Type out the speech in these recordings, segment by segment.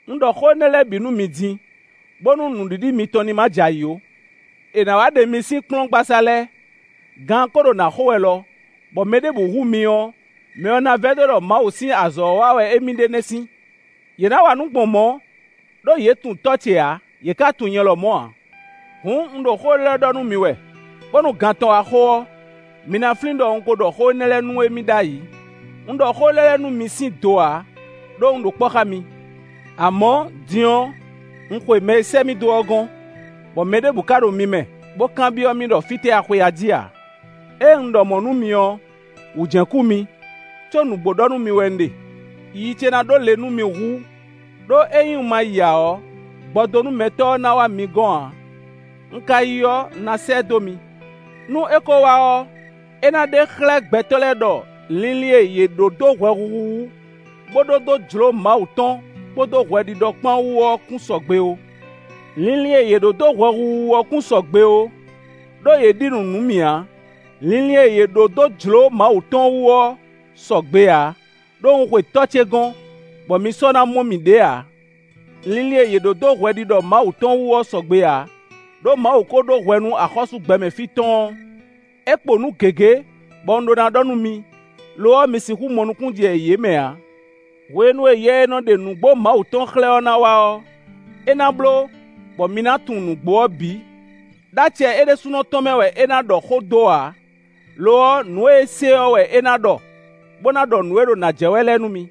“Un ɖɔ xó énɛ́ lɛ́ɛ bǐ nú mi din, bónú nǔɖiɖi mitɔn ní ma jɛ ayǐ ó. È nǎ wá ɖe mi sín kplɔ́ngbasá lɛ́ɛ. Gan ɔ́ ko ɖo nǎ xo wɛ lɔ, bɔ mɛ ɖěbǔ hu mi ɔ́, mɛ ɔ́ ná vɛdó ɖɔ Mawu sín azɔ̌ wa wɛ émí ɖe nɛ́ sín. Yě ná wa nǔ gbɔn mɔ̌, ɖó yě tunwun Tɔ́ ce ǎ; yě ká tunwun nyɛ lɔmɔ̌ ǎ. Hǔn, un ɖo xó élɔ́ lɛ́ɛ ɖɔ nú mi wɛ, bónú gan tɔn wá xo ɔ́, mi ná flín ɖɔ un ko ɖɔ xó énɛ́ lɛ́ɛ nú émí ɖ'ayǐ.” Azɔ̌ e Yɛsinsɛn nɔ wa lɛ́ɛ “Un ɖɔ xó élɔ́ lɛ́ɛ nú mi sín do ǎ, ɖó un ɖo kpɔ́ xá mi. Amɔ̌, din ɔ́, un xwe mɛ e sɛ́ mì dó ɔ́ gɔ́n, bɔ mɛ ɖěbǔ ka ɖo mi mɛ, bó kanbyɔ́ mì ɖɔ fítɛ́ a xwe ají ǎ. Ée un ɖɔ mɔ̌ nú mi ɔ́, wǔ jɛ́n kú mi, có nǔgbó ɖɔ nú mi wɛ un ɖe: yiyi ce ná ɖó le nú mi hú; ɖó ényí un ma yi ǎ ɔ́, gbɔdónúmɛtɔ́ ɔ́ ná wá mi gɔ́n ǎ. Un ka yi ɔ́, un ná sɛ́ ɛ dó mi. Nú é ko wá ɔ́, é ná ɖe xlɛ́ gbɛtɔ́ lɛ́ɛ ɖɔ linlin e yě ɖó dó hwɛhuhu wú, bó ɖó dó jlǒ Mawu tɔn kpódó hwɛɖiɖɔ kpán wú ɔ́ kún sɔgbe ó. Linlin e yě ɖǒ dó hwɛhuhu wú ɔ́ kún sɔgbe ó; ɖó yě ɖi nǔ nú mì ǎ. Linlin e yě ɖǒ dó jlǒ Mawu tɔn wú ɔ́ sɔgbe ǎ, ɖó un xwe Tɔ́ ce gɔ́n, bɔ mi sɔ́ ná mɔ mì ɖě ǎ. Linlin e yě ɖǒ dó hwɛɖiɖɔ Mawu tɔn wú ɔ́ sɔgbe ǎ, ɖó Mawu ko ɖó hwɛ nú axɔ́sú gbɛmɛ fí tɔn ɔ́. “É kpo nǔ gěgé, bɔ un ɖó ná ɖɔ nú mi; lo ɔ́, mi sixú mɔ nukúnnú jɛ yě mɛ ǎ. Hwenu e Yɛ e nɔ ɖe nǔgbó Mawu tɔn xlɛ́ ɔ́ ná wá ɔ́, é ná bló, bɔ mi ná tunwun nǔgbó ɔ́ bǐ; ɖó acɛ é ɖésúnɔ tɔn mɛ wɛ é ná ɖɔ xó dó ǎ; lo ɔ́, nǔ e é se ɔ́ wɛ é ná ɖɔ, bó ná ɖɔ nǔ e ɖo na jɛ wɛ lɛ́ɛ nú mi.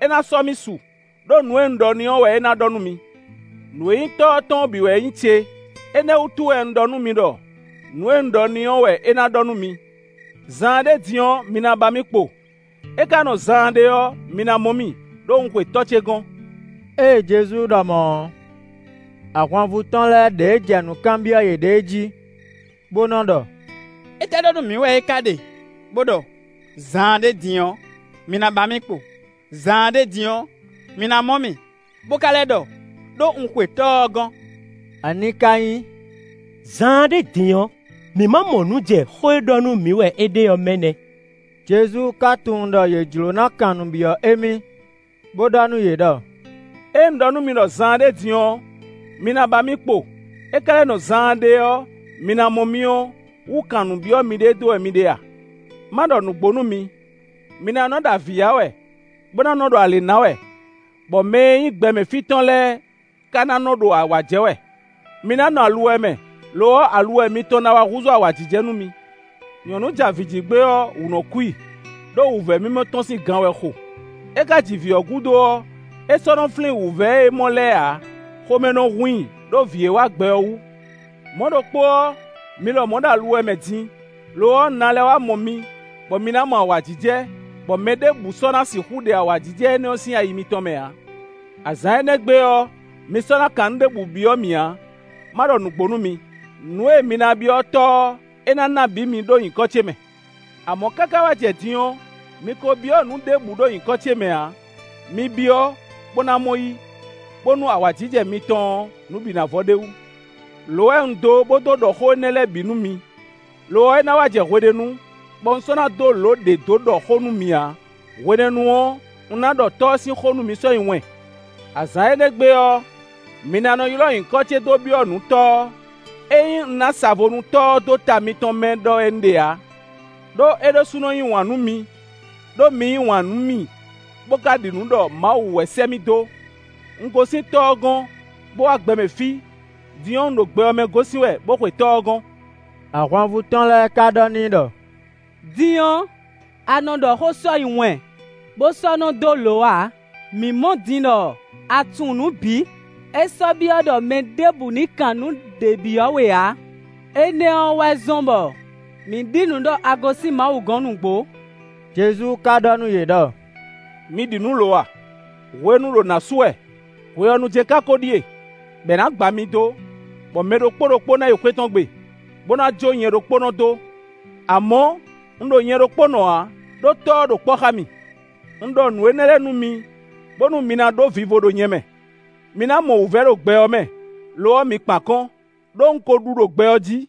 É ná sɔ́ mì su, ɖó nǔ e un ɖɔ n'i ɔ́ wɛ é ná ɖɔ nú mi. Nǔ e nyí Tɔ́ ɔ́ tɔn ɔ́ bǐ wɛ nyí ce. Énɛ́ wútu wɛ un ɖɔ nú mi ɖɔ: nǔ e un ɖɔ n'i ɔ́ wɛ é ná ɖɔ nú mi.” “Zaanɖé din ɔ́, mi na ba mì kpo; é ka nɔ zaanɖé ɔ́, mi ná mɔ mì, ɖó un xwe Tɔ́ ce gɔ́n.” Ée Jezu ɖɔ mɔ̌ ɔ́, ahwanvú tɔn lɛ́ɛ ɖěe jɛ nǔ kanbyɔ́ yěɖée jí, bo nɔ ɖɔ: “Étɛ́ ɖɔ nú mǐ wɛ é ka ɖe, bo ɖɔ: ‘Zaanɖé din ɔ́, mi na ba mì kpo; zaanɖé din ɔ́, mi ná mɔ mì; bo ka lɛ́ ɖɔ: ɖó un xwe Tɔ́ ɔ́ gɔ́n!’ Ani ka nyí: ‘Zaanɖé din’ ɔ́? Mǐ ma mɔ nǔ jɛ xó e ɖɔ nú mǐ wɛ é ɖe ɔ́ mɛ nɛ́!” Jezu ka tunwun ɖɔ yě jló ná kan nǔ byɔ́ émí, bó ɖɔ nú yě ɖɔ: “Ée un ɖɔ nú mi ɖɔ zaanɖé din ɔ́, mi ná ba mì kpo, é ka lɛ́ nɔ zaanɖé ɔ́ mi ná mɔ mì ɔ́, wú kan nǔ byɔ́ miɖée dó wɛ mi ɖe a?” Má ɖɔ nǔgbó nú mi: mi ná nɔ́ ɖo avǐ ya wɛ, bó ná nɔ́ ɖo alě ná wɛ, bɔ mɛ e nyí gbɛmɛ fí tɔn lɛ́ɛ ka ná nɔ́ ɖo awǎ jɛ wɛ. Mi ná nɔ aluwɛ mɛ, lo ɔ́, aluwɛ mitɔn ná wá húzú awǎjijɛ nú mi. Nyɔ̌nu ja vǐ ji gbé ɔ́, wǔ nɔ́ kú i, ɖó wǔvɛ́ mimɔ tɔn sín gan wɛ xo; é ka ji vǐ ɔ́ gúdo ɔ́, é sɔ́ nɔ́ flín wǔvɛ́ e é mɔ lɛ́ɛ ǎ, xomɛ nɔ hun i ɖó vǐ e wá gbɛ ɔ́ wú. Mɔ̌ ɖokpó ɔ́, mi lɔmɔ̌ ɖo aluwɛ mɛ din; lo ɔ́, un ná lɛ́ wá mɔ mi, bɔ mi ná mɔ awǎjijɛ, bɔ mɛ ɖěbǔ sɔ́ ná sixú ɖe awǎjijɛ énɛ́ sín ayi mitɔn mɛ ǎ. “Azǎn énɛ́ gbe ɔ́, mi sɔ́ ná kan nǔ ɖěbǔ byɔ́ mì ǎ. Má ɖɔ nǔgbó nú mi: nǔ e mi ná byɔ́ Tɔ́ ɔ́, é ná ná bǐ mi ɖó nyǐkɔ ce mɛ. Amɔ̌, káká wá jɛ din ɔ́, mi ko byɔ́ nǔ ɖěbǔ ɖo nyǐkɔ ce mɛ ǎ; mi byɔ́, bó ná mɔ yí, bónú awǎjijɛ mitɔn ɔ́, nǔ bǐ na vɔ ɖ'é wú.” “Lǒ wɛ un dó, bo dó ɖɔ xó énɛ́ lɛ́ɛ bǐ nú mi; lo ɔ́, é ná wá jɛ hweɖénu, bɔ un sɔ́ ná dó lǒ ɖě dó ɖɔ xó nú mi ǎ. Hwenɛ́nu ɔ́, un ná ɖɔ Tɔ́ ɔ́ sín xó nú mi sɔ́ nyi wɛn. Azǎn énɛ́ gbe ɔ́, mi ná nɔ́ ylɔ́ nyǐkɔ ce dó byɔ́ nǔ Tɔ́ ɔ́. Ényí un ná sa vo nú Tɔ́ ɔ́ dó ta mitɔn mɛ ɖɔ wɛ un ɖe ǎ. Đó é ɖésúnɔ yí wǎn nú mi, ɖó mi yí wǎn nú mì, bó ka ɖi nǔ ɖɔ Mawu wɛ sɛ́ mì dó. Un gosín Tɔ́ ɔ́ gɔ́n, bó wá gbɛ mɛ fí; din ɔ́, un ɖo gbɛ ɔ́ mɛ gosín wɛ, bó xwe Tɔ́ ɔ́ gɔ́n.” Ahwanvú tɔn lɛ́ɛ ka ɖɔ n'i ɖɔ: “Din ɔ́, a nɔ ɖɔ xó sɔ́ nyi wɛn, bo sɔ́ nɔ dó lǒ ǎ. Mǐ mɔ din ɖɔ a tunwun nǔ bǐ; é sɔ́ byɔ́ ɖɔ mɛ ɖěbǔ ní kan nǔɖé byɔ́ we ǎ. Énɛ́ ɔ́ wɛ zɔ́n bɔ mǐ ɖi nǔ ɖɔ a gosín Mawu gɔ́n nǔgbó.” Jezu ka ɖɔ nú yě ɖɔ: “Mi ɖi nǔ lo a? Hwenu ɖo nǎ su wɛ; hwe ɔ́ nu jɛ́n ka ko ɖíe, bɔ è nǎ gba mi dó, bɔ mɛ ɖokpó ɖokpó ná yi xwé tɔn gbe, bó ná jó nyɛ ɖokpónɔ dó; amɔ̌, un ɖo nyɛ ɖokpónɔ ǎ, ɖó Tɔ́ ɔ́ ɖo kpɔ́ xá mì. Un ɖɔ nǔ énɛ́ lɛ́ɛ nú mi, bónú mi ná ɖó vivo ɖo nyɛ mɛ. Mi ná mɔ wǔvɛ́ ɖo gbɛ ɔ́ mɛ; lo ɔ́, mi kpan akɔ́n, ɖó un ko ɖu ɖo gbɛ ɔ́ jí.”